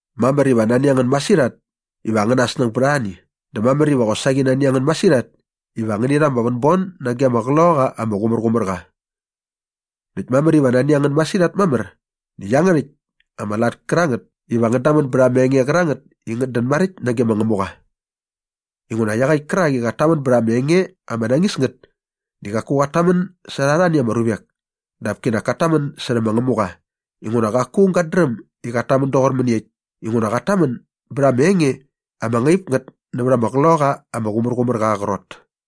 Mamär iva nani a ngän masirhat iva angäna snäng bät arhani dä mamär iva qosaqi nani a ngän masirhat iva ngäni rha ama vänbon nage ama Qloqaqa ama Qumärqumärqa. Näkt mamär iva nani a ngän masirhat mamär nä iangärhäkt ama lat kärangät iva ngän damän bät ama enge qärangät i ngät dän maräkt nage ma Ngämuqa. Inguna iaqäkt kärak i qat tamän bät ama enge ama nañis ngät di qaku qat tamän särha arhani ama ruvek dap kinak kat tamän särhä ma Ngämuqa inguna qaku aung gat dräm i qat tamän doqor mäniekt inguna qat tamän bät ama enge ama ngaip ngät nävät ama Qloqaqa ama Qumärqumärqa aa qrot.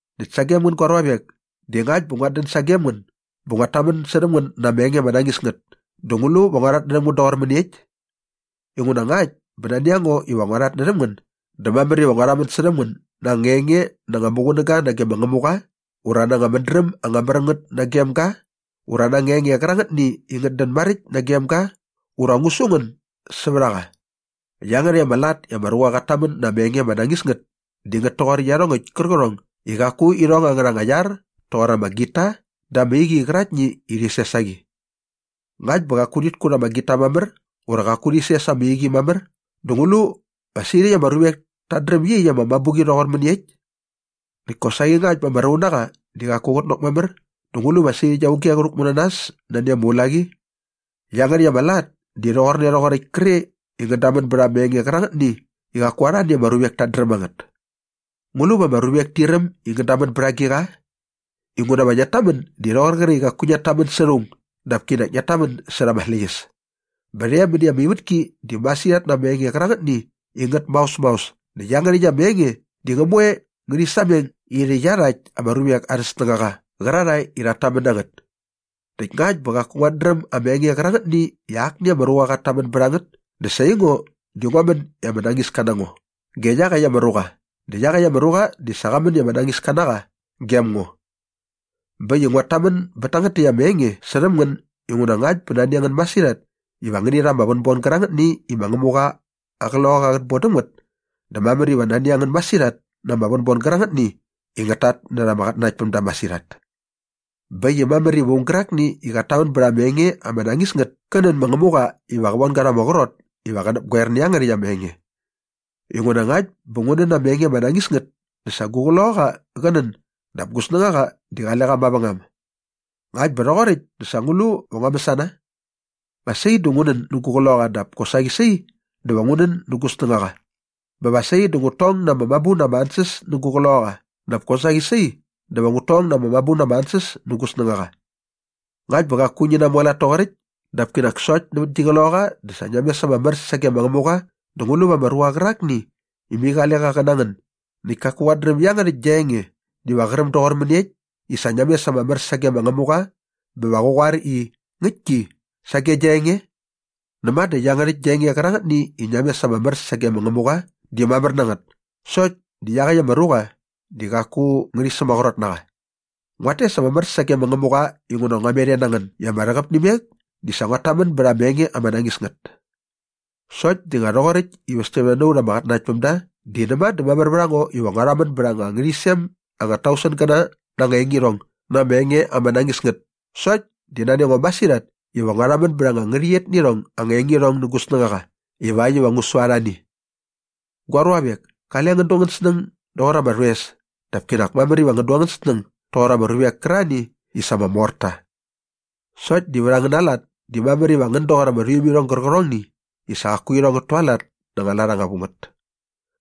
Näkt sagem ngän gua ruavek, di ngakt bä nguat dän sagem ngän bä nguat tamän särhäm ngän na ama enge ama nañis ngät dä ngu lu va ngua rhatnärhäm ngän doqor mäniekt? Inguna ngakt bä nani a ngo iva ngua rhatnärhäm ngän dä mamär iva ngua rhamän särhäm ngän na anga enge na anga muqunäga nage ma Ngämuqa ura na anga mädräm anga mär ngät nagem ga ura na anga enge qärangätni i ngät dän maräkt nagem ga ura va ngu su ngän sävät a qa. Iangärhäkt ama lat iva ama ruqa qat tamän na ama enge ama nañis ngät di ngät toqor iarhongäkt kärqärhong i qaku irhong angärha anga iar toqor ama gita dä ama iqi qäraktni i rhi ses a qi. Ngakt bä qaku rhit kut ama gita mamär ura qaku rhi ses ama iqi mamär dä ngu lu va sirhäkt ama ruvek tat dräm iaqyäkt ama mabuqi rhoqor mäniekt? Näkt kosaqi ngakt bä ama raunaqa di qaku qä nanok mamär dä ngu lu va sirhäkt auge qä rhäkmu na nas nani ama ulaqi? Iangärhäkt ama lat di rhoqorne rhoqoräkt kre i ngän damän bät ama enge qärangätni i qaku arhani ama ruvek tat dräm a ngät. Ngu lu va ama ruvek ti räm i ngän damän bät agiqa? Inguna va ngiat tamän di rhoqor qre i qaku ngiat tamän särha aung dap kinak ngiat tamän särha ama släqyäs. Bä rhe mäni ama ivätki di masirhat na ama enge qärangätni i ngät maos maos näkt iangärhäkt ama enge di ngä moe ngärhi sameng irhä iarhakt ama ruvek arhä snängaqa qärarhae i rhat tamän na ngät. Näkt ngakt bä qaku nguat dräm ama enge qärangätni i akni ama ruqa qat tamän bät a ngät dä sa aingo di ngua män i ama nañiska na ngo ge iaqäkt ama ruqa dä iaqäkt ama ruqa di sa qa män i ama nañiska na qa gem ngo. Bä äkt i nguat tamän bät tangät täkt ama enge särhäm ngän inguna ngakt bä nani a ngän masirhat iva ngäni rha ama vänbon gärangätni i ma Ngämuqa aa Qloqaqa qät bon däm ngät dä mamär iva nani a ngän masirhat na ama vänbon gärangätni i ngät tatnärha ama qatnanaktpämda masirhat. Bä äkt i mamär iva aung gärakni i qat tamän bät ama enge ama nañis ngät kä nän ma Ngämuqa iva qä von ga rha ama qrot iva qä näpgoer nä iangärhäkt ama enge. Inguna ngakt bä ngu nän na ama enge ama nañis ngät dä sa gu qloqaqa qä nän dap gu snängaqa di qale qa mavängam. Ngakt bä rhoqoräkt dä sa ngu lu va ngua mäsana? Va sai dä ngu nän nä gu qloqaqa dap kosaqi sai dä va ngu nän nä gu snängaqa. Bä va sai dä ngut tong na ama mabu na ama ansäs nä gu qloqaqa dap kosaqi sai dä va ngut tong na ama mabu na ama ansäs nä gu snängaqa. Ngakt bä qaku ngi namualat toqoräkt dap kinak sokt nävät gi qloqaqa dä sa ngia mes ama mär sage ma Ngämuqa dä ngu lu va ama ruqa qärakni i mai qale qa qä na ngän näkt kaku qat dräm iangärhäkt gia enge diva qä räm doqor mäniekt i sa ngia mes ama mär sage ma Ngämuqa bä va qä qoar i “Ngäktki” sage gia enge? Näma dä iangärhäkt gia enge qärangätni i ngia mes ama mär sage ma Ngämuqa di mamär na ngät sokt di iaqäkt ama ruqa di qaku ngärhi sämaqrot na qa. Nguat tes ama mär sage ma Ngämuqa inguna ngua met e na ngän i ma ama rhäqäp nä imek di sa nguat tamän bät ama enge ama nañis ngät. Sokt di nga rhoqoräkt i västämne na ut ama qatnanaktpämda di näma dä mamär vät a ngo iva ngua rhamän bät anga ngärhäqyisem anga tausengäna na anga engirhong na ama enge ama nañis ngät sokt di nani a ngo masirhat iva ngua rhamän bät anga ngärhäqyet nä irhong anga engirhong nä gu snängaqa ivakt iva ngu su arhani. Gua ruavek, kale ngän du angän snäng doqor ama rhoes dap kinak mamär iva ngän du angän snäng doqor ama ruvek kärarhani i sa ama mor ta. Sokt di vät angäna lat di mamär iva ngän doqor ama rhuimirhong gärqärhongni i sa qaku irhong ngät tualat na anga lat anga vu ngät.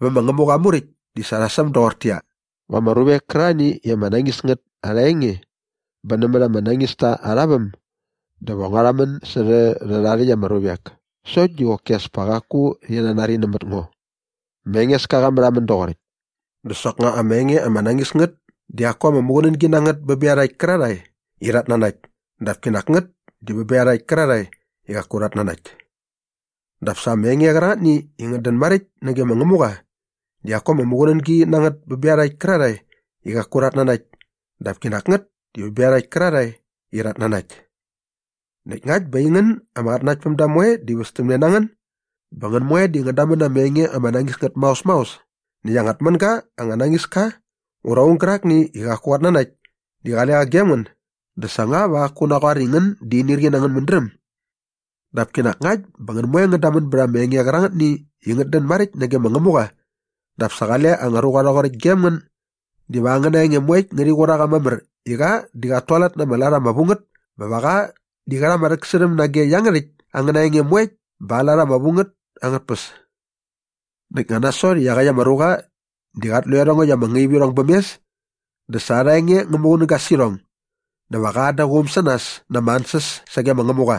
Vä ma Ngämuqa aa Muräkt di sa rha säm doqortäqyia, “Va ama ruvek kärarhani i ama nañis ngät arha enge bä nämät ama nañista arha väm dä va ngua rhamän särhä rhärha rhäkt ama ruvek sokt di qoki as pa qaku rhi nanari nämät ngo. Ma Engeska qa märhamän doqoräkt.” Dä soknga ama enge ama nañis ngät di qaku ama muqunängi na ngät bä bä iarhakt kärarhae i rhat nanakt dap kinak ngät di bä bä iarhakt kärarhae i qaku rhat nanakt. Dap sa ama enge qärangätni i ngät dän maräkt nage ma Ngämuqa di qaku ama muqunängi na ngät bä bä iarhakt kärarhae i qaku rhat nanakt dap kinak ngät di bä bä iarhakt kärarhae i rhat nanakt. Näkt ngakt bä aingän ama qatnanaktpämda moe di västämne na ngän bä ngän moe di ngän damän na ama enge ama nañis ngät maos maos näkt anga tmänga anga nañis ka ura aung gärakni i qaku qat nanakt di qale qa gem ngän dä sa nga va qaku qä naqoar i ngän di inirqi na angän mädräm? Dap kinak ngakt bä ngän moe ngän damän bät ama enge qärangätni i ngät dän maräkt nage ma Ngämuqa dap sa qale anga ruqa rhoqoräkt gem ngän diva angäna enge moekt ngärhi qur a qa mamär i qa di qat tualat na ama lat ama vu ngät bä va qa di qä rha ama rhäksärhäm nage iangärhäkt angäna enge moekt bät aa lat ama vu ngät angät tpäs. Näkt nga nasot i iaqäkt ama ruqa di qat lu i iarhongäkt ama ngaivirhong bäm mes di sa arha enge ngä muqunäga sä irhong dä va qa an da aa quum sä nas na ama ansäs sage ma Ngämuqa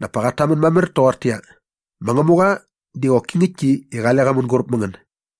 dap pa qat tamän mamär toqortäqyia, “Ma Ngämuqa di qoki ngäktki i qale qa mänguräp mä ngän.”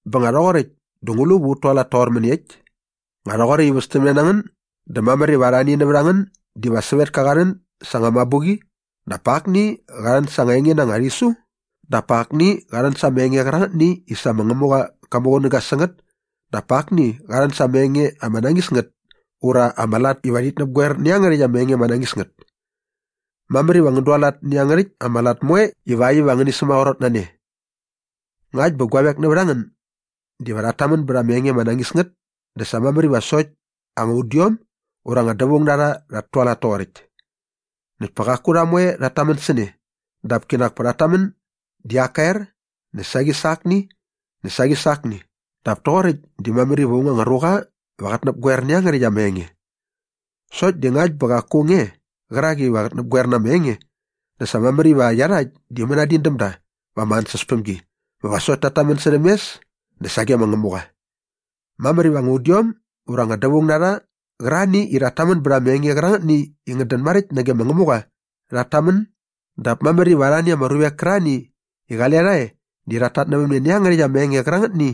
Bä nga rhoqoräkt dä ngu lu va ut tualat toqor mäniekt? Nga rhoqoräkt i västämne na ngän dä mamär iva arhani nävät a ngän diva sävetka qa rhän sa anga mabuqi dap pa akni qa rhän sa anga enge na ama rhisu dap pa akni qa rhän sa ama enge qärangätni i sa ma Ngämuqa qa muqunäga sä ngät dap pa akni qa rhän sa anga enge ama nañis ngät ura ama lat iva rhit näpgoer nä iangärhäkt ama enge ama nañis ngät. Mamär iva ngän dualat nä iangärhäkt ama lat moe ivakt iva ngäni sämaqrot na ne. Ngakt bä guavek nävät a ngän diva rhat tamän bät ama enge ama nañis ngät dä sa mamär iva sokt anga udiom ura anga dävaung na rha rhat tualat toqoräkt. Näkt pa qaku rha moe rhat tamän sä ne dap kinak pa rhat tamän di ak ka er näkt saqi sa akni näkt saqi sa akni dap toqoräkt di mamär iva aung anga ruqa va qät näpgoer nä iangärhäkt ama enge. Sokt di ngakt bä qaku aung e qärak iva qät näpgoer na ama enge dä sa mamär iva iarhakt di mänadin däm da va ama ansäspämgi bä va sokt tat tamän särhäm mes dä sage ma Ngämuqa. Mamär iva anga udiom ura anga dävaung na rha qärarhani i rhat tamän bät ama enge qärangätni i ngät dän maräkt nage ma Ngämuqa rhat tamän dap mamär iva arhani ama ruvek kärarhani i qale rha e di rhat tatnävämne nä iangärhäkt ama enge qärangätni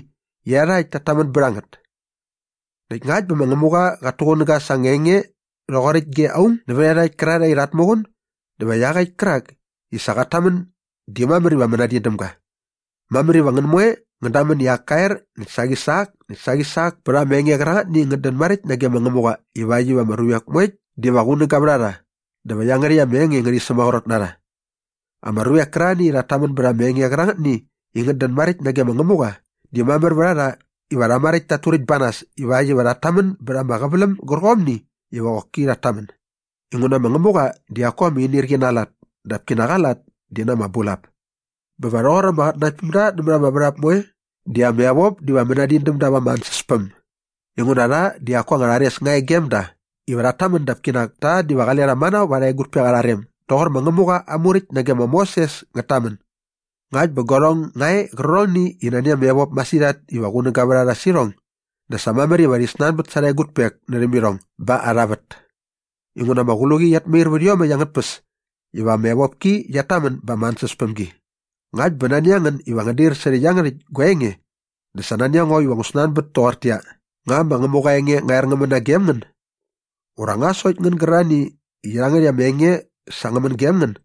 i iarhakt tat tamän bät a ngät. Näkt ngakt bä ma Ngämuqa qat tuqunäga sa anga enge rhoqoräkt ge aung nävät iarhakt kärarhae i rhat muqun dä va iaqäkt kärak i sa qat tamän di mamär iva mänadin däm ga. Mamär iva ngän moe ngän damän i ak ka er näkt saqi sa ak näkt saqi sa ak pät ama enge qärangätni i ngät dän maräkt nage ma Ngämuqa ivakt iva ama ruvek moekt diva qunäga vät a rha dä va iangärhäkt ama enge ngärhi sämaqrot na rha. Ama ruvek kärarhani i rhat tamän bät ama enge qärangätni i ngät dän maräkt nage ma Ngämuqa di mamär vät a rha iva rha maräkt tat turäkt ba nas ivakt iva rhat tamän bät ama qäväläm gärqomni iva qoki rhat tamän inguna ma Ngämuqa di qaku ama inirqi na aa lat dap kinak aa lat di na ama bulap. Bä va rhoqor ama qatnanaktpämda nämät ama värhap moe di ama evop diva mänadin däm da va ama ansäspäm. Inguna rha di qaku anga rhares nga e gem da iva rhat tamän dap kinak ta diva qale rha manao va arha egutpek arha rem doqor ma Ngämuqa aa Muräkt nage ma Moses ngät tamän. Ngakt bä guarhong nga e qärqärhongni i nani ama evop masirhat iva qunäga vät a rha sä irhong dä sa mamär iva rhi snanbät sa arha egutpek närhäm irhong ba arha vät. Inguna ama qluqi qiat mair vät iomäkt angät tpäs iva ama evopki qiat tamän ba ama ansäspämgi. Ngakt bä nani a ngän iva ngän dair särhä iangärhäkt gua enge dä sa nani a ngo iva ngu snanbät toqortäqyia, “Nga ma Ngämuqa aa enge ngä er ngä män nagem ngän? Ura nga sokt ngän gärarhani i iangärhäkt ama enge sa ngä män gem ngän?”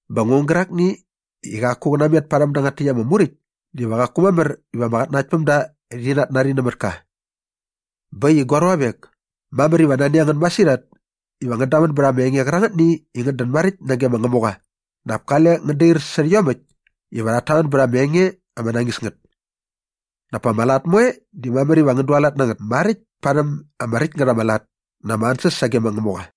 Bä aung gärakni i qaku qä natmet parhäm dangät täkt ama muräkt diva qaku mamär iva ama qatnanaktpämda rhi natnari nämät ka. Bä äkt i gua ruavek, mamär iva nani a ngän masirhat iva ngän damän bät ama enge qärangätni i ngät dän maräkt nage ma Ngämuqa dap kale ngän dair särhä iomäkt iva rhat tamän bät ama enge ama nañis ngät. Dap pa ama lat moe di mamär iva ngän dualat na ngät maräkt parhäm ama räkt ngät ama lat na ama ansäs sage ma Ngämuqa.